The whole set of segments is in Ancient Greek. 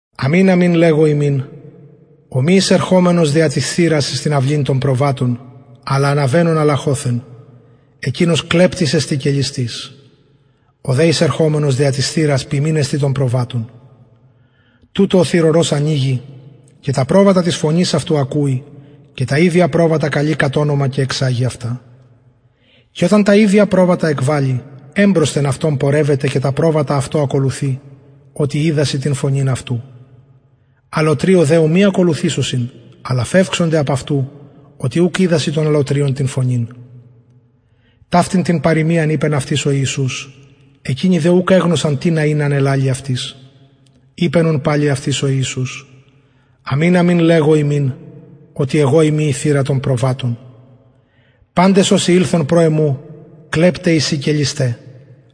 αμην αμην λεγω υμιν ο μη εισερχομενος δια της θυρας εις την αυλην των προβατων αλλα αναβαινων αλλαχοθεν εκεινος κλεπτης εστιν και ληστης ο δε εισερχομενος δια της θυρας ποιμην εστιν των προβατων τουτω ο θυρωρος ανοιγει και τα προβατα της φωνης αυτου ακουει και τα ιδια προβατα καλει κατ ονομα και εξαγει αυτα και οταν τα ιδια προβατα εκβαλη εμπροσθεν αυτων πορευεται και τα προβατα αυτω ακολουθει οτι οιδασιν την φωνην αυτου αλλοτριω δε ου μη ακολουθησωσιν αλλα φευξονται απ αυτου οτι ουκ οιδασιν των αλλοτριων την φωνην ταυτην την παροιμιαν ειπεν αυτοις ο ιησους εκεινοι δε ουκ εγνωσαν τινα ην α ελαλει αυτοις ειπεν ουν παλιν αυτοις ο ιησους αμην αμην λεγω υμιν οτι εγω ειμι η θυρα των προβατων παντες οσοι ηλθον κλεπται εισιν και λησται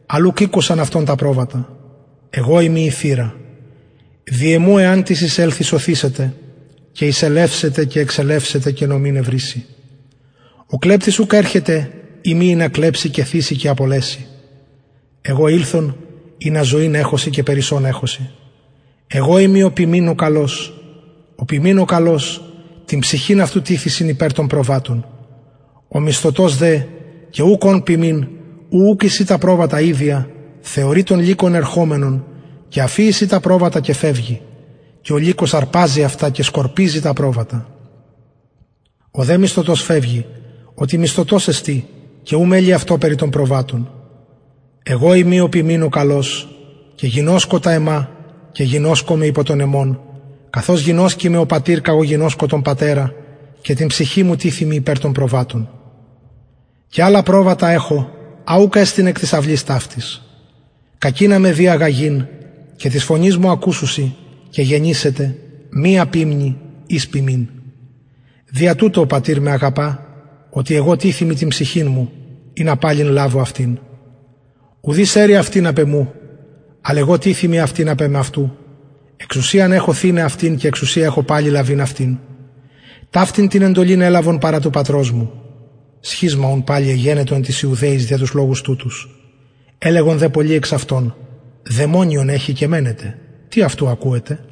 αλλ ουκ ηκουσαν αυτων τα προβατα εγω ειμι η θυρα δι εμου εαν τις εισελθη σωθησεται και εισελευσεται και εξελευσεται και νομην ευρησει ο κλεπτης ουκ ερχεται ει μη ινα κλεψη και θυση και απολεση εγω ηλθον ινα ζωην εχωσιν και περισσον εχωσιν εγω ειμι ο ποιμην ο καλος ο ποιμην ο καλος την ψυχην αυτου τιθησιν υπερ των προβατων ο μισθωτος δε και ουκ ων ποιμην ου ουκ εισιν τα προβατα ιδια θεωρει τον λυκον ερχομενον και αφιησιν τα προβατα και φευγει και ο λυκος αρπαζει αυτα και σκορπιζει τα προβατα ο δε μισθωτος φευγει οτι μισθωτος εστιν και ου μελει αυτω περι των προβατων εγω ειμι ο ποιμην ο καλος και γινωσκω τα εμα και γινωσκομαι υπο των εμων καθως γινωσκει με ο πατηρ καγω γινωσκω τον πατερα και την ψυχην μου τιθημι υπερ των προβατων και αλλα προβατα εχω α ουκ εστιν εκ της αυλης ταυτης κακεινα με δει αγαγειν και της φωνης μου ακουσουσιν και γενησεται μια ποιμνη εις ποιμην δια τουτο ο πατηρ με αγαπα οτι εγω τιθημι την ψυχην μου ινα παλιν λαβω αυτην ουδεις αιρει αυτην απ εμου αλλ εγω τιθημι αυτην απ εμαυτου εξουσιαν εχω θειναι αυτην και εξουσιαν εχω παλιν λαβειν αυτην ταυτην την εντολην ελαβον παρα του πατρος μου σχισμα ουν παλιν εγενετο εν τοις ιουδαιοις δια τους λογους τουτους ελεγον δε πολλοι εξ αυτων δαιμονιον εχει και μαινεται τι αυτου ακουετε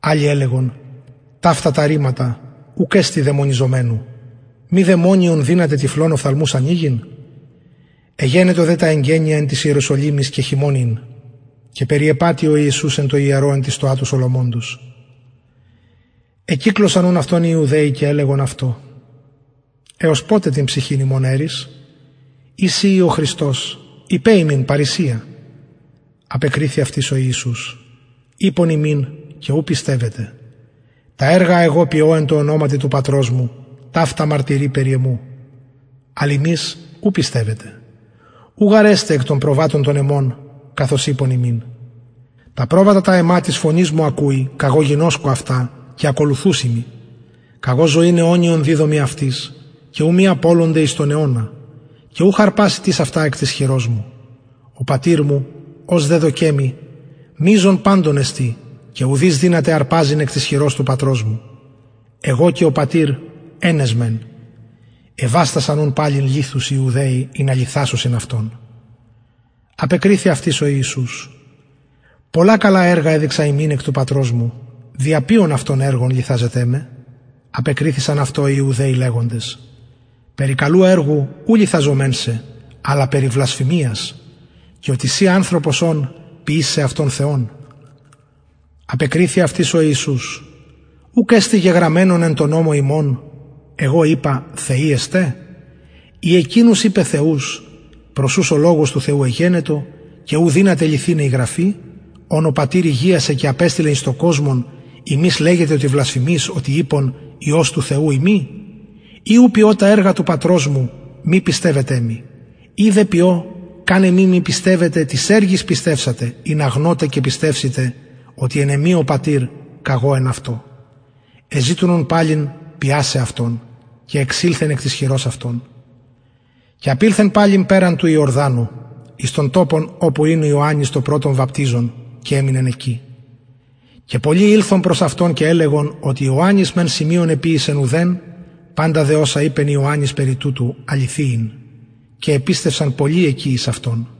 αλλοι ελεγον ταυτα τα ρηματα ουκ εστιν δαιμονιζομενου μη δαιμονιον δυναται τυφλων οφθαλμους ανοιγειν εγενετο δε τα εγκαινια εν ιεροσολυμοις και χειμων ην και περιεπατει ο ιησους εν τω ιερω εν τη στοα σολομωνος εκυκλωσαν ουν αυτον οι ιουδαιοι και ελεγον αυτω εως ποτε την ψυχην ημων αιρεις ει συ ει ο χριστος ειπε ημιν παρρησια απεκριθη αυτοις ο ιησους ειπον υμιν και ου πιστευετε τα εργα α εγω ποιω εν τω ονοματι του πατρος μου ταυτα μαρτυρει περι εμου αλλ υμεις ου πιστευετε ου γαρ εστε εκ των προβατων των εμων καθως ειπον υμιν τα προβατα τα εμα της φωνης μου ακουει καγω γινωσκω αυτα και ακολουθουσιν μοι καγω ζωην αιωνιον διδωμι αυτοις και ου μη απολωνται εις τον αιωνα και ουχ αρπασει τις αυτα εκ της χειρος μου ο πατηρ μου ος δεδωκεν μοι μειζων παντων εστιν και ουδεις δυναται αρπαζειν εκ της χειρος του πατρος μου εγω και ο πατηρ εν εσμεν εβαστασαν ουν παλιν λιθους οι ιουδαιοι ινα λιθασωσιν αυτον απεκριθη αυτοις ο ιησους πολλα καλα εργα εδειξα υμιν εκ του πατρος μου δια ποιον αυτων εργον λιθαζετε με απεκριθησαν αυτω οι ιουδαιοι λεγοντες περι καλου εργου ου λιθαζομεν σε αλλα περι βλασφημιας και οτι συ ανθρωπος ων ποιεις σεαυτον θεον απεκριθη αυτοις ο ιησους ουκ εστιν γεγραμμενον εν τω νομω υμων εγω ειπα θεοι εστε ει εκεινους ειπεν θεους προς ους ο λογος του θεου εγενετο και ου δυναται λυθηναι η γραφη ον ο πατηρ ηγιασεν και απεστειλεν εις τον κοσμον υμεις λεγετε οτι βλασφημεις οτι ειπον υιος του θεου ειμι ει ου ποιω τα εργα του πατρος μου μη πιστευετε μοι ει δε ποιω καν εμοι μη πιστευητε τοις εργοις πιστευσατε ινα γνωτε και πιστευσητε οτι εν εμοι ο πατηρ καγω εν αυτω εζητουν ουν παλιν αυτον πιασαι και εξηλθεν εκ της χειρος αυτων και απηλθεν παλιν περαν του ιορδανου εις τον τοπον οπου ην ιωαννης το πρωτον βαπτιζων και εμεινεν εκει και πολλοι ηλθον προς αυτον και ελεγον οτι ιωαννης μεν σημειον εποιησεν ουδεν παντα δε οσα ειπεν ιωαννης περι τουτου αληθη ην και επιστευσαν πολλοι εκει εις αυτον